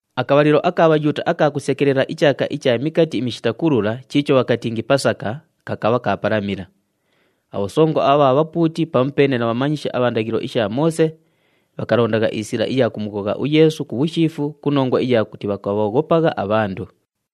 Akabhalilo aka Bhayuuta aka kusekelela ichaaka icha Mikati iMishita Kulula chiicho bhakatingi Pasaka, kakabha kaapalamila. Abhosongo abha bhapuuti pamupeene na bhamanyishi abha ndaghilo isha Moose, bhakalondagha isila iya kumughogha uYeesu ku bhushiifu ku nongwa iya kuti bhakabhooghopagha abhandu.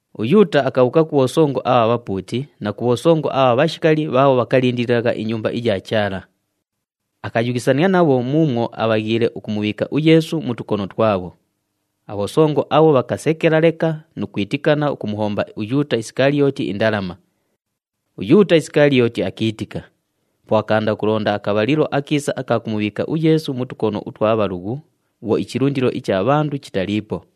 UYuuta akabhuuka ku bhosongo abha bhapuuti na ku bhosongo abha bhashikali bhaabho bhakalindililagha iNyumba iya Chaala. Akayughisania nabho muumwo abhaghiile ukumubhiika uYeesu mu tukono twabho. Abhosongo abho bhakasekela leka nu kwitikana ukumuhomba uYuuta Isikaliyooti indalama. UYuuta Isikaliyooti akiitika, po akaanda ukulonda akabhalilo akiisa aka kumubhiika uYeesu mu tukono utwa bhalughu bhwo ichilundilo icha bhandu chitaliipo.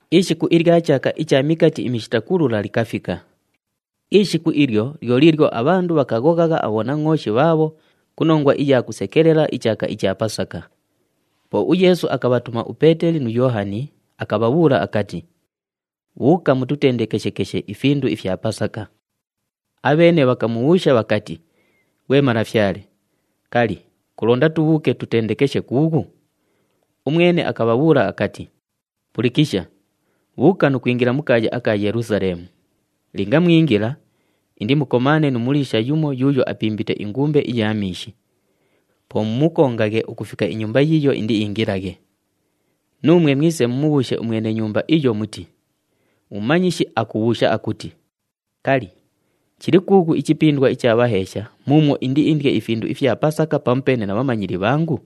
Ishiku ilya chaaka icha Mikati iMishita Kulula likafika. Ishiku ilyo lyo liilyo abhandu bhakughoghagha abhonangʼooshi bhaabho ku nongwa iya kusekelela ichaaka icha Pasaka. Po uYeesu akabhatuma uPeeteli nu Yoohani, akabhabhuula akati, “Bhuuka mututendekeshekeshe ifindu ifya Pasaka.” Abheene bhakamubhuusha bhakati, “Ghwe Malafyale, kali, kulonda tubhuuke tutendekeshe kuughu?” Umwene akabhabhuula akati, “Pulikisha, bhuuka nu kwingila mu kaaya aka Yelusaleemu. Linga mwingila, indimukomaane nu muliisha yumo yuuyo apimbite ingumbe iya miishi. Po mumukongaghe ukufika inyumba yiiyo indiingilaghe. Nuumwe mwise mumubhuushe umwene nyumba iyo muti, ‘UMumanyishi akubhuusha akuti, “Kali, chili kuughu ichipindwa icha bhaheesha muumwo indiindye ifindu ifya Pasaka pamupeene na bhamanyili bhangu?” ’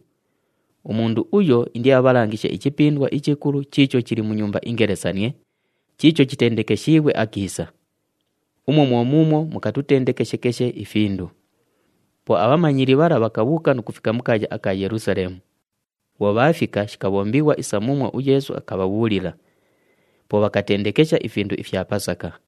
Umundu uyo indiabhalangishe ichipindwa ichikulu chiicho chili mu nyumba ingelesanie, chiicho chitendekeshiighwe akiisa. Umwo mwo muumwo mukatutendekeshekeshe ifindu.” Po abhamanyili bhala bhakabhuuka nu kufika mu kaaya aka Yelusaleemu. Bhwo bhaafika, shikabhombighwa isa muumwo uYeesu akabhabhuulila. Po bhakatendekesha ifindu ifya Pasaka.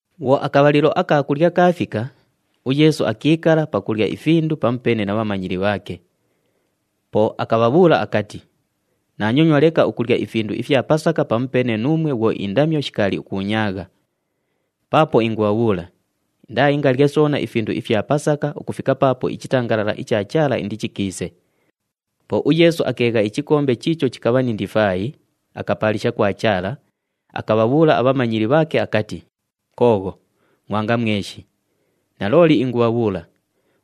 Bhwo akabhalilo aka kulya kaafika, uYeesu akiikala pakulya ifindu pamupeene na bhatumighwa bhaake. Po akabhabhuula akati, “Naanyonywa leka ukulya ifindu ifya Pasaka pamupeene nuumwe bhwo indamyo shikaali ukuunyaagha. Paapo ingubhabhuula, indaaingalye soona ifindu ifya Pasaka ukufika paapo ichitangalala icha Chaala indichikiise.” Po uYeesu akeegha ichikombe chiicho chikabha ni ndifaayi, akapaalisha kwa Chaala, akabhabhuula abhamanyili bhaake akati, “Koogho, ngʼwanga mweshi. Nalooli ingubhabhuula,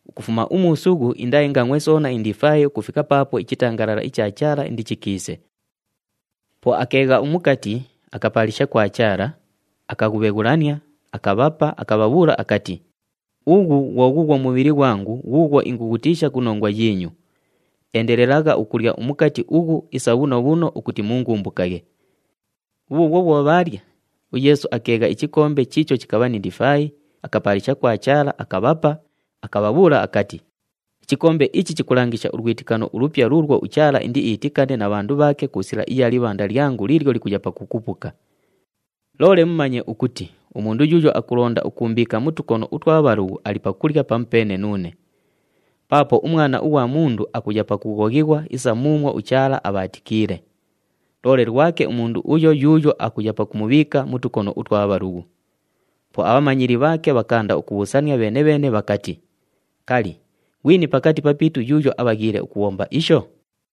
ukufuma umuusughu indaaingangʼwe soona indifaayi ukufika paapo ichitangalala icha Chaala indichikiise.” Po akeegha umukati, akapaalisha kwa Chaala, akaghubheghulania, akabhapa, akabhabhuula akati, [“Ughu ghwo ghuughwo mubhili ghwangu ghuughwo ingughutiisha ku nongwa yiinyu. Endelelagha ukulya umukati ughu isa bhuno bhuno ukuti muungumbukaghe.” Bhubhuubhwo bhwo bhaalya, uYeesu akeegha ichikombe chiicho chikabha ni ndifaayi, akapaalisha kwa Chaala, akabhapa, akabhabhuula akati, “Ichikombe ichi chikulangisha ulwitikano ulupya luulwo uChaala indiitikane na bhandu bhaake ku sila iya libhanda lyangu liilyo likuya pakukupuka.] “Loole mumanye ukuti umundu yuuyo akulonda ukuumbiika mu tukono utwa bhalughu ali pakulya pamupeene nuune. Paapo uMwana ughwa Mundu akuya pakughoghighwa isa muumwo uChaala abhaatikiile. Loole lwake umundu uyo yuuyo akuya pakumubhiika mu tukono utwa bhalughu!” Po abhamanyili bhaake bhakaanda ukubhuusania bheene-bheene bhakati, “Kali, ghwini pakati papiitu yuuyo abhaghiile ukubhomba isho?”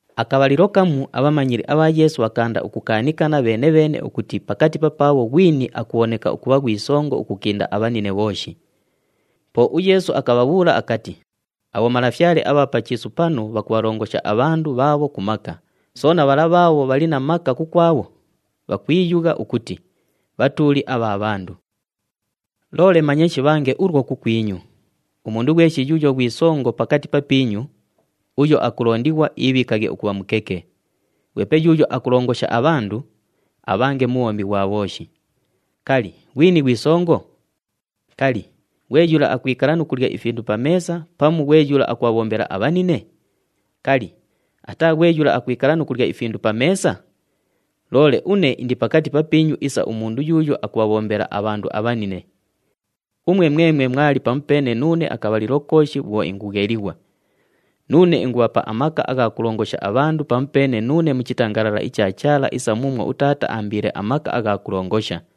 Akabhalilo kamu abhamanyili abha Yeesu bhakaanda ukukaanikana bheene-bheene ukuti pakati papaabho ghwini akubhoneka ukubha ghwi songo ukukinda abhanine bhooshi. Po uYeesu akabhabhuula akati, “Abhomalafyale abha pa chiisu panu bhakubhalongosha abhandu bhaabho ku maka, soona bhala bhaabho bhali na maka kukwabho, bhakwiyugha ukuti, ‘Bhatuuli abha bhandu.’ “Loole manye shibhange ulwo kukwinyu. Umundu ghweshi yuuyo ghwi songo pakati papiinyu, uyo akulondighwa iibhiikaghe ukubha mukeke. Ghwepe yuuyo akulongosha abhandu, abhange mubhombi ghwa bhooshi. Kali, ghwini ghwi songo? Kali, ghwe yula akwikala nu kulya ifindu pa meesa pamu ghwe yula akubhabhombela abhanine? Kali, ataa ghwe yula akwikala nu kulya ifindu pa meesa? Loole une indi pakati papiinyu isa umundu yuuyo akubhabhombela abhandu abhanine. “Umwe mwemwe mwali pamupeene nuune akabhalilo kooshi bhwo ingughelighwa. Nuune ingubhapa amaka agha kulongosha abhandu pamupeene nuune mu chitangalala icha Chaala isa muumwo uTaata aambiile amaka agha kulongosha.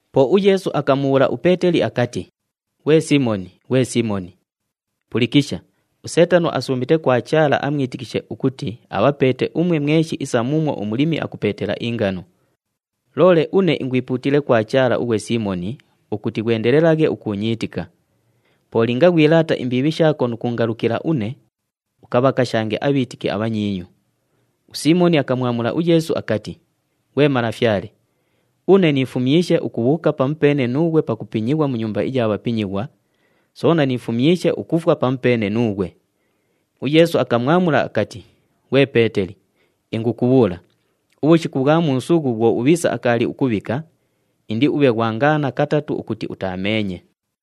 Po uYeesu akamubhuula uPeeteli akati, “Ghwe Siimoni, ghwe Siimoni! Pulikisha, uSeetano asuumite kwa Chaala amwitikishe ukuti abhapeete umwe mweshi isa muumwo umulimi akupeetela ingano. Loole une ingwipuutiile kwa Chaala ughwe Siimoni ukuti ghwendelelaghe ukuunyiitika. Po linga ghwilaata imbiibhi shaako nu kuungalukila une, ukabhakashange abhiitiki abhanyiinyu.” USiimoni akamwamula uYeesu akati, “Ghwe Malafyale, une niifumyishe ukubhuuka pamupeene nuughwe pakupinyighwa mu nyumba iya bhapinyighwa, soona niifumyishe ukufwa pamupeene nuughwe.” UYeesu akamwamula akati, “Ghwe Peeteli, ingukubhuula, ubhushiku ubhwa muusughu bhwo ubhiisa akaali ukubhika, indiubhe ghwangaana katatu ukuti utaameenye.”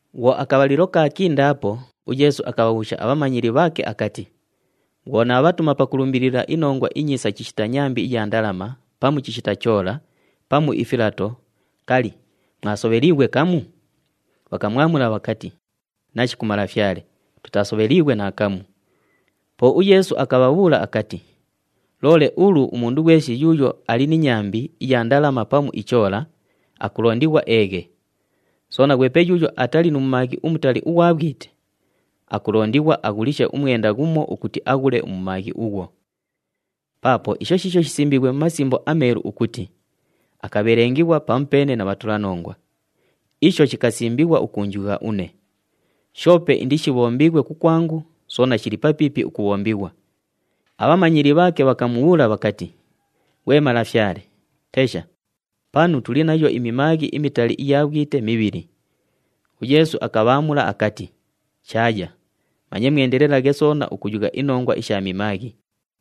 Bhwo akabhalilo kaakindaapo uYeesu akabhabhuusha abhamanyili bhaake akati, “Bhwo naabhatuma pakulumbilila iNongwa iNyiisa chishita nyambi iya ndalama, pamu chishita choola, pamu ifilato, kali, mwasobheliighwe kamu?” Bhakamwamula bhakati, “Nashiku Malafyale, tutaasobheliighwe naakamu.” Po uYeesu akabhabhuula akati, “Loole ulu umundu ghweshi yuuyo ali ni nyambi iya ndalama pamu ichoola, akulondighwa eeghe. Soona, ghwepe yuuyo atali nu mumaaghi umutali ughwa bhwite, akulondighwa aghulishe umwenda ghumo ukuti aghule umumaaghi ughwo. Paapo isho shiisho shisimbiighwe mu Masimbo aMeelu ukuti, ‘Akabhelengelighwa pamupeene na bhatulanongwa.’ Isho shikasimbighwa ukuunjugha une. Shoope indishibhombighwe kukwangu, soona shili papiipi ukubhombighwa.” Abhamanyili bhaake bhakamubhuula bhakati, “Ghwe Malafyale! Tesha, panu tuli nayo imimaaghi imitali iya bhwite mibhili.” UYeesu akabhaamula akati, “Shaaya, manye mwendelelaghe soona ukuyugha inongwa isha mimaaghi.”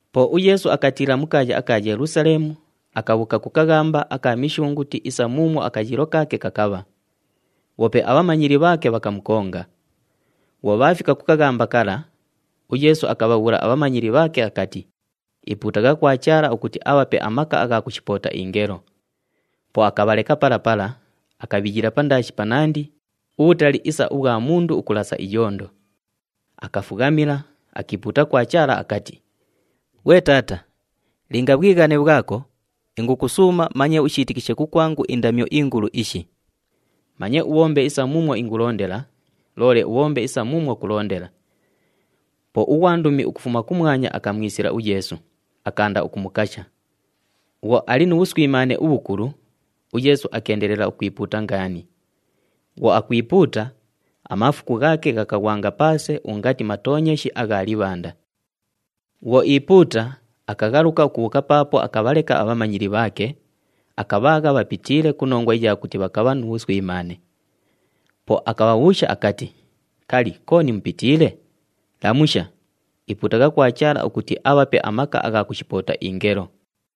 Po uYeesu akatiila mu kaaya aka Yelusaleemu, akabhuuka ku kaghamba aka Mishunguti isa muumwo akayiilo kaake kakabha. Bhoope abhamanyili bhaake bhakamukonga. Bhwo bhaafika ku kaghamba kala, uYeesu akabhabhuula abhamanyili bhaake akati, “Ipuutagha kwa Chaala ukuti abhape amaka agha kushipoota ingelo.” Po akabhaleka pala pala, akabhiyila pandaashi panandi, ubhutali isa ubhwa mundu ukulasa iyondo. Akafughamila, akiipuuta kwa Chaala akati, “Ghwe Taata, linga bhwighane bhwako, ingukusuuma manye ushiitikishe kukwangu indamyo ingulu ishi! Manye ubhombe isa muumwo ingulondela, loole ubhombe isa muumwo kulondela.” [ Po ughwandumi ukufuma kumwanya akamwisila uYeesu, akaanda ukumukasha. Bhwo ali mu bhuswimaane ubhukulu, uYeesu akeendelela ukwipuuta ngaani. Bhwo akwipuuta, amaafuku ghaake ghakaghwanga paase ungati matoonyeshi agha libhanda.] Bhwo iipuuta, akaghaluka ukubhuuka paapo akabhaleka abhamanyili bhaake, akabhaagha bhapitiile ku nongwa iya kuti bhakabha nu bhuswimaane. Po akabhabhuusha akati, “Kali, kooni mupitiile? Lamusha! Ipuutagha kwa Chaala ukuti abhape amaka agha kushipoota ingelo.”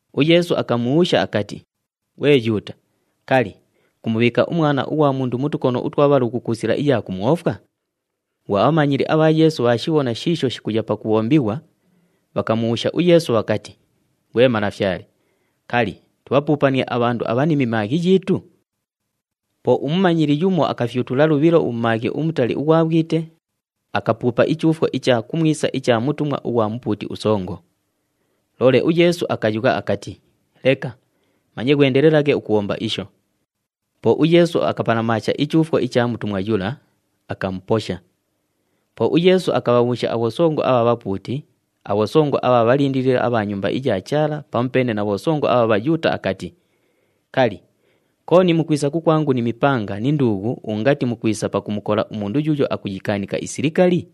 UYeesu akamubhuusha akati, “Ghwe Yuuta! Kali, kumubhiika uMwana ughwa Mundu mu tukono utwa bhalughu ku sila iya kumwofwa?” Bhwo abhamanyili abha Yeesu bhaashibhona shiisho shikuya pakubhombighwa, bhakamubhuusha uYeesu bhakati, “Ghwe Malafyale, kali, tubhapuupanie abhandu abha ni mimaaghi yiitu?” Po umumanyili yumo akafyutula lubhilo umumaaghi umutali ughwa bhwite, akapuupa ichuufwo icha kumwisa icha mutumwa ughwa mupuuti usongo. Loole uYeesu akayugha akati, “Leka! Manye ghwendelelaghe ukubhomba isho.” Po uYeesu akapalamaasha ichuufwo icha mutumwa yula, akamuposha. Po uYeesu akabhabhuusha abhosongo abha bhapuuti, abhosongo abha bhalindilili abha Nyumba iya Chaala pamupeene na bhosongo abha Bhayuuta akati, “Kali, kooni mukwisa kukwangu ni mipanga ni nduughu ungati mukwisa pakumukola umundu yuuyo akuyikaanika isilikali?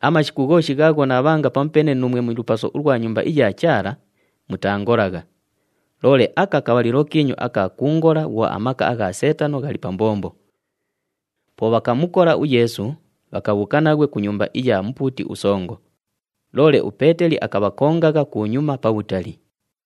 Amashiku ghooshi ghaagho naabhanga pamupeene nuumwe mu lupaso ulwa Nyumba iya Chaala, mutaangolagha! Loole aka kabhalilo kiinyu aka kuungola bhwo amaka agha Seetano ghali pa mbombo.” Po bhakamukola uYeesu, bhakabhuuka naghwe ku nyumba iya mupuuti usongo. Loole uPeeteli akabhakongagha kunyuma pabhutali.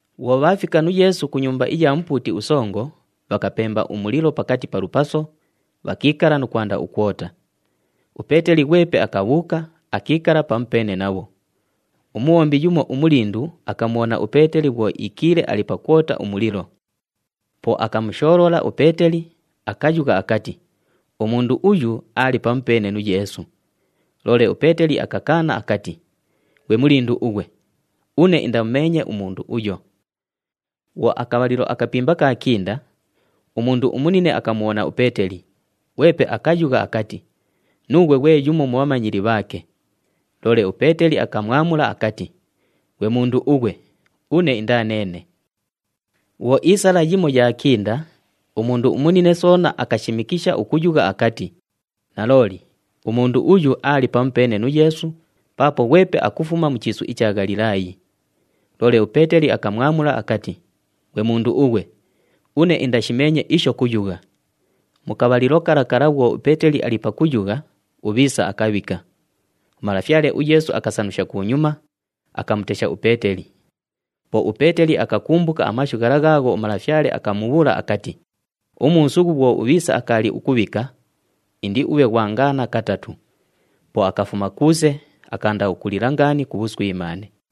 Bhwo bhaafika nu Yeesu ku nyumba iya mupuuti usongo, bhakapemba umulilo pakati pa lupaso, bhakiikala nu kwanda ukwota. UPeeteli ghwepe akabhuuka, akiikala pamupeene nabho. Umubhombi yumo umulindu akamubhona uPeeteli bhwo iikiile ali pakwota umulilo. Po akamushoolola uPeeteli, akayugha akati, “Umundu uyu aali pamupeene nu Yeesu.” Loole uPeeteli akakaana akati, “Ghwe mulindu ughwe! Une indamumeenye umundu uyo!” Bhwo akabhalilo akapimba kaakinda, umundu umunine akamubhona uPeeteli, ghwepe akayugha akati, “Nuughwe ghwe yumo mu bhamanyili bhaake.” Loole uPeeteli akamwamula akati, “Ghwe mundu ughwe, une indaa neene!” Bhwo iisala yimo yaakinda, umundu umunine soona akashimikisha ukuyugha akati, “Nalooli, umundu uyu aali pamupeene nu Yeesu paapo ghwepe akufuma mu chiisu icha Ghalilaayi!” Loole uPeeteli akamwamula akati, “Ghwe mundu ughwe! Une indashimeenye isho kuyugha!” Mu kabhalilo kala kala bhwo uPeeteli ali pakuyugha, ubhiisa akabhika. UMalafyale uYeesu akasanusha kunyuma, akamutesha uPeeteli. Po uPeeteli akakumbuka amashu ghala ghaagho uMalafyale akamubhuula akati, “Umuusughu bhwo ubhiisa akaali ukubhika, indiubhe ghwangaana katatu.” Po akafuma kuuse, akaanda ukulila ngaani ku bhuswimaane.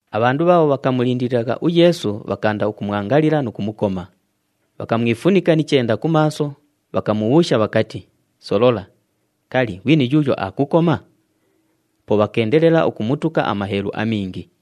Abhandu bhaabho bhakamulindililagha uYeesu bhakaanda ukumwangalila nu kumukoma. Bhakamwifunika ni chenda ku maaso, bhakamubhuusha bhakati, “Solola! Kali, ghwini yuuyo aakukoma?” Po bhakeendelela ukumutuka amaheelu amingi.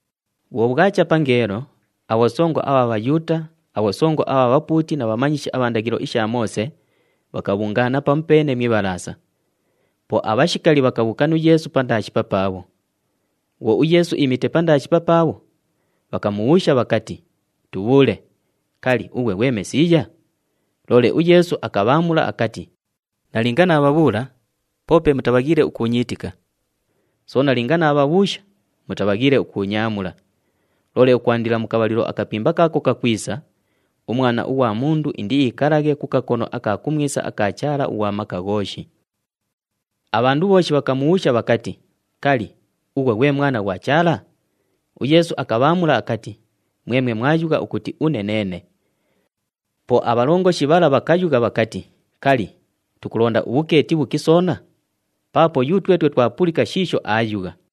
Bhwo bhwacha pangeelo, abhosongo abha Bhayuuta, abhosongo abha bhapuuti na bhamanyishi abha ndaghilo isha Moose, bhakabhungaana pamupeene mu Ibhalaasa. Po abhashikali bhakabhuuka nu Yeesu pandaashi papaabho. Bhwo uYeesu iimite pandaashi papaabho, bhakamubhuusha bhakati, “Tubhuule! Kali, ughwe ghwe Mesiiya?” Loole uYeesu akabhaamula akati, “Nalinga naabhabhuula, poope mutabhaghiile ukuunyiitika. Soona linga naabhabhuusha, mutabhaghiile ukuunyaamula. Loole ukwandila mu kabhalilo akapimba kaako kakwisa, uMwana ughwa Mundu indiikalaghe ku kakono aka kumwisa aka Chaala ughwa Maka Ghooshi.” Abhandu bhooshi bhakamubhuusha bhakati, “Kali, ughwe ghwe Mwana ghwa Chaala?” UYeesu akabhaamula akati, “Mwemwe mwayugha ukuti une neene.” Po abhalongoshi bhala bhakayugha bhakati, “Kali, tukulonda ubhukeeti bhuki soona? Paapo yutwetwe twapulika shiisho aayugha.”